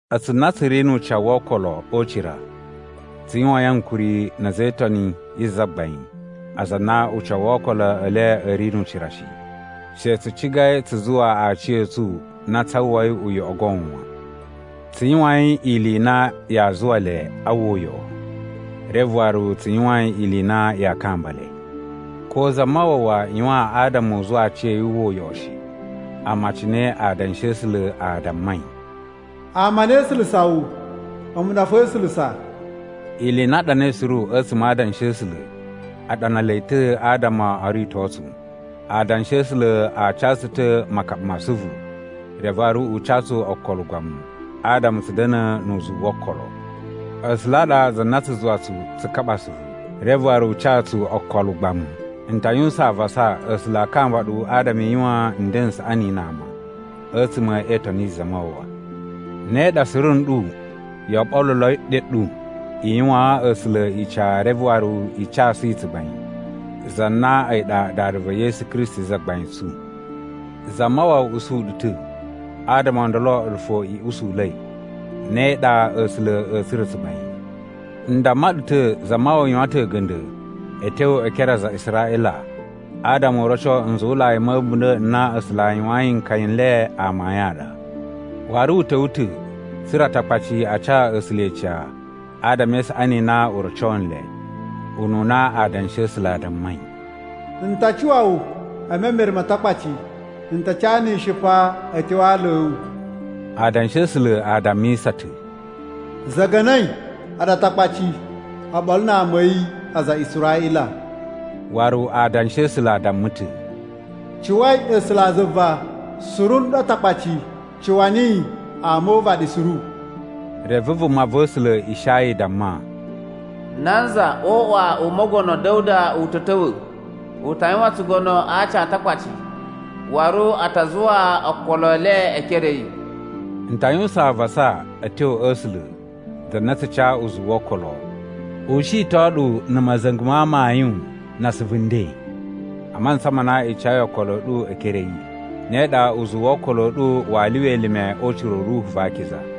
A̱tsu na tsu ri nu ucawu wo okolo o ucira, tsu yuwain ankuri na̱ a̱za̱ e Itoni yi Zagbain aza a na ucawu wo okolo e le a̱ ri nu ucira shi. She tsu cigai tsu zuwa aciya̱tsu na tsaa uwwai uyoꞌo goon wan. Tsu yuwain ili i na yaa zuwa le a uwwa uyoꞌo, reve waru tsu yuwain ili i na yaa kamba le. Ko Zamawawa yuwan adama u zuwa aciya̱yi wu uwwa uyoꞌo shi. Amma cine Adanshi a̱ A̱sula̱ a dammai, “Ama a na e isulusa wu a̱mu ɗa fo e isulusa.” Ili i na a ɗanai suru a̱tsuma̱ a Adanshi a̱ A̱sula̱ a ɗana le ta̱ adama o rito tsu. Adanshi a̱ A̱sula̱ a ca tsu ta̱ makaɓa ma asuvu, reve waru u ca tsu okolo ugbamu, adama tsu da̱na̱ nu uzuwu wo okolo. A̱sula̱ a ɗa za na tsu zuwa tsu tsu kaɓa asuvu, reve waru u ca tsu okolo ugbamu. N ta yuwusan avasa A̱sula̱ a kamba ɗu adama i yuwan nden n saꞌani na ama, a̱tsuma̱ e itoni yi Zamawawa. Ne ɗa suru nɗu yoo ɓoluloi ɗyo ɗu i yuwaan A̱sula̱ ica reve waru i casu yi tsugbain, za na a̱yi ɗa Dada va̱ Yesu Kristi Zagbain tsu. Zamawawa usu ɗu ta̱, adama o ndolo a̱ɗu fo i usula̱i. Ne ɗa A̱sula̱ a̱a̱ tsura̱ tsugbain. N damma ɗu ta̱ Zamawawa yuwan ta̱ a̱ga̱nda̱ a̱ tyo e ekere a aza a Israꞌila adama u roco nzuwulai ma̱ a̱bunda̱ n na A̱sula̱ a yuwayin nkaya n le amayun a ɗa. Waru u ta̱wa̱ ta̱ tsa̱ra̱ Atakpaci a ca A̱sula̱ ica adama e isaꞌani i na u roco nle. Ununa Adanshi a̱ A̱sula̱ a dammai: “N ta cuwa wu e memere ma Atakpaci. N ta cana ica a̱ tyo a aala a̱ wu.” Adanshi a̱ A̱sula̱ a dammisa ta̱: “Za̱nga̱na̱i, a̱ɗu Atakpaci, oɓolo na ama a̱ yi, aza a Israꞌila.” Waru Adanshi a̱ A̱sula̱ a damma ta̱: “Cuwai A̱sulazuva, suru nɗu Atakpaci. Cuwa niyi, ama o uvaɗi suru.” Reve vumava̱sula̱ Ishaya damma, “Nanza o uꞌwa u Mogono Da̱wuda u ta̱ ta̱wa̱, u ta yuwan tsugono a aci a Atakpaci, waru a ta zuwa okolo e le e ekere a̱ yi.” N ta yuwusan avasa a̱ tyo a̱ A̱sula̱, za na tsu ca uzuwu wo okolo, u shiton ɗu na̱ ma̱za̱nga̱ ma amayun na asuvu nden, a mantsa ma na i cayi okolo a̱ ɗu e ekere a̱ yi. Ne ɗa uzuwu wo okolo a̱ ɗu waa lyuwa elime o ucira u Ruhu va Akiza.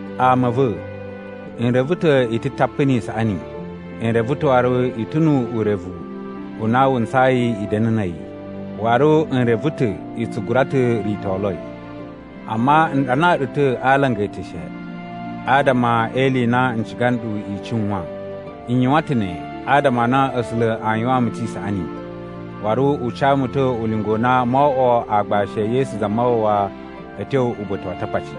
Ama a̱ va̱, n reve ta̱ i ta̱ tapu ni isaꞌani. N reve ta̱ waru i ta̱ nu urevu u na wu ntsayi i da̱na̱ na̱ a̱yi, waru n reve ta̱ i tsu gura ta̱ ritoloi. Amma n ɗanaa ɗu ta̱ a alanga eteshe adama e ili i na n ciga nɗu i cuwan. N yuwan ta̱ ne adama a na A̱sula̱ a yuwaan mu ta̱ isaꞌani, waru u ca mu ta̱ ulinga u na moo oꞌwo aagbashi e Yesu Zamawawa a̱ tyo uba̱ta̱ wa Atakpaci.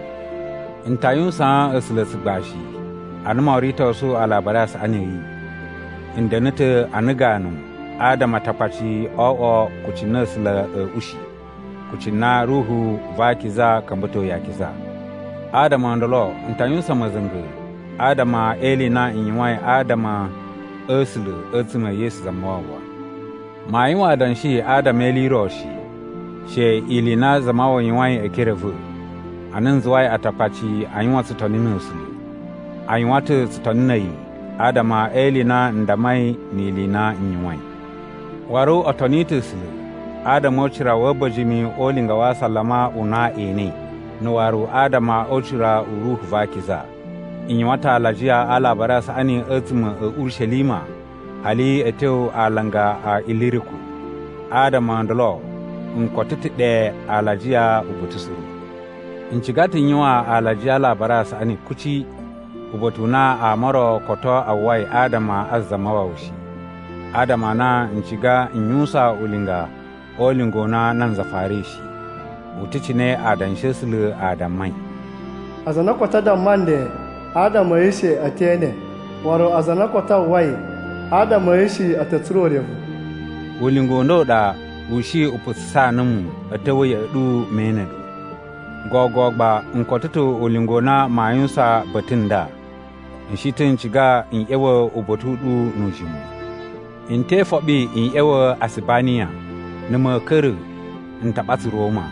N ta yuwusaan A̱sula̱ tsugbashi ana mo ritosu Alabari a Saꞌani a̱ yi. N da̱na̱ ta̱ ana ganu adama Atakpaci o oꞌwo kucci na A̱sula̱ a̱a̱ ushi, kucci na Ruhu va Akiza ka̱mba̱toi akiza. Adama o ndolo, n ta yuwusan ma̱za̱nga̱ adama e ili i na n yuwain adama a̱ A̱sula̱ a̱tsuma̱ e Yesu Zamawawa. Maa yuwan adanshi adama e ili i ro shi, she ili i na Zamawawa yuwain e ekere a̱ va̱, ana n zuwai Atakpaci a yuwan tsutoni na̱ A̱sula̱. A yuwan ta̱ tsutoni na̱ a̱yi adama e ili i na n dammai ni ili i na n yuwain. Waru o toni ta̱ A̱sula̱ adama o ucira wa̱ a̱ba̱jini o ulinga wa asalama u na e enei, na̱ waru adama o ucira u Ruhu va Akiza. N yuwan ta̱ alajiya a Alabari a Saꞌani a̱tsuma̱ a̱ Urishelima hali a̱ tyo alanga a Iliriku, adama o ndolo n koto ta̱ ɗe alajiya uba̱ta̱ suru. N ciga ta̱ n yuwan alajiya a Alabari a Saꞌani kuci uba̱ta̱ u na ama o ro koto a uwwai adama a Zamawawa shi, adama a na n ciga n yuwusan ulinga o ulinga u na nanza farai shi. U ta̱ cine Adanshi a̱ A̱sula̱ a dammai: “Aza a na koto a damma nle adama a̱ yi shi e te ene, waru aza a na koto a uwwai adama a̱ yi shi, a̱ ta̱ tsura̱ urevu.” Ulinga u nda u ɗa u shi u putsusaa numu a̱ ta̱wa̱ ya̱ꞌa̱ ɗu me ene ɗu. Gogo gba n koto ta̱ ulinga u na maa yuwusan ba̱ta̱ nda. N shi ta̱ n ciga n ꞌya̱wa̱ uba̱ta̱ u ɗu nu ujimu. N te ifoɓi n ꞌya̱wa̱ Asibaniya, na̱ ma̱a̱ ka̱ra̱, n ta ɓatsa Roma.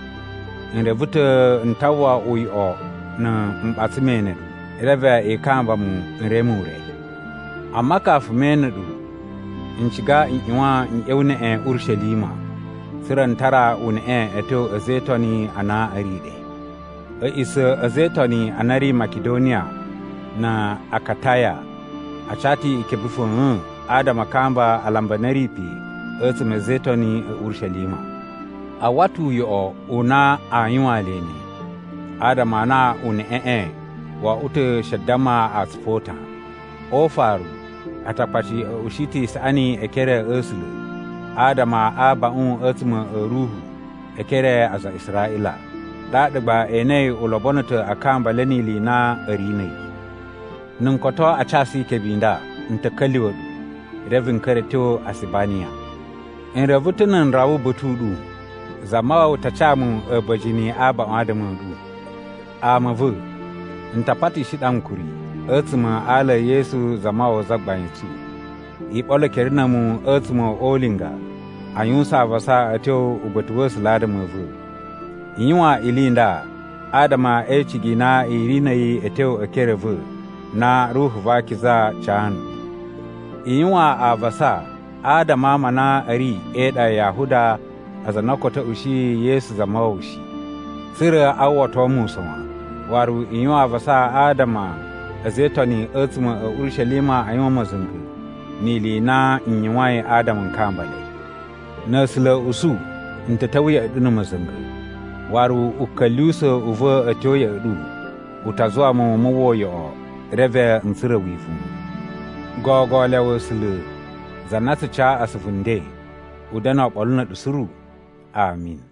N reve ta̱ n ta uwwa uyoꞌo na̱ m ɓatsa me ene ɗu, reve i kamba mu n reme ure. Amma kafu me ene ɗu, n ciga n ꞌyuwan n ꞌya̱wa̱ neꞌen Urishelima tsa̱ra̱ n tara uneꞌe a̱ tyo a̱za̱ e Itoni a na a̱ ri ɗe. A̱ꞌisa̱ a̱ a̱za̱ e Itoni a na a̱ ri Makidoniya na̱ Akataya a ca ta̱ ikebe fa̱a̱n adama a kamba alambi a na a̱ ri pe a̱tsuma̱ a̱ a̱za̱ e Itoni a̱ Urishelima. A uwwa ta̱ uyoꞌo u na aa yuwaan le ne, adama a na uneꞌeꞌe wo oꞌwo ta̱ she damma atsupu o utan. O ufaru, Atakpaci a̱ ushi ta̱ isaꞌani e ekere a̱ A̱sula̱ adama a abaꞌun a̱tsuma̱ a̱ ruhu e ekere a aza a Israꞌila. Ɗaɗa gba e enei u lobono ta̱ a kamba le ni ili i na a̱ ri na̱ a̱yi. Na̱ n koto a casu ikebe i nda, n ta̱ ka̱lyuwa̱ ɗu, reve n ka̱ra̱ a̱ tyo Asibaniya. N reve ta̱ na̱ n rawa uba̱ta̱ u ɗu, Zamawawa ta ca mu a̱ba̱jini abaꞌun adama a̱ ɗu. Ama a̱ va̱, n ta patishi ɗu ankuri a̱tsuma̱ a ala e Yesu Zamawawa Zagbain tsu, i ɓolo ekere na̱ a̱mu a̱tsuma̱ o ulinga a yuwusan avasa a̱ tyo uba̱ta̱ wa̱ A̱sula̱ adama a̱ va̱. I yuwan ili i nda adama e icigi i na i ri na̱ a̱yi a̱ tyo e ekere a̱ va̱ na Ruhu va Akiza ca nɗu. I yuwan avasa adama a ama a na a̱ ri e iɗa ya Yahuda aza a na koto a̱ ushiyi Yesu Zamawawa shi, tsa̱ra̱ a uwwato mu usa̱n wan. Waru i yuwan avasa adama a̱ a̱za̱ e Itoni a̱tsuma̱ a̱ Urishelima a yuwan ma̱za̱nga̱ ni ili i na n yuwain adama n kamba le. Na̱ A̱sula̱ a̱ usu, n ta̱ ta̱wa̱ ya̱ꞌa̱ ɗu na̱ ma̱za̱nga̱, waru uka̱lyuwusa̱ u va̱ a̱ tyo ya̱ꞌa̱ ɗu u ta zuwa mu mu uwwa uyoꞌo reve n tsura̱ wivuwun. Gogo lyawa A̱sula̱, za na tsu ca asuvu nden, u da̱na̱ oɓolo na̱ a̱ɗu suru. Ami.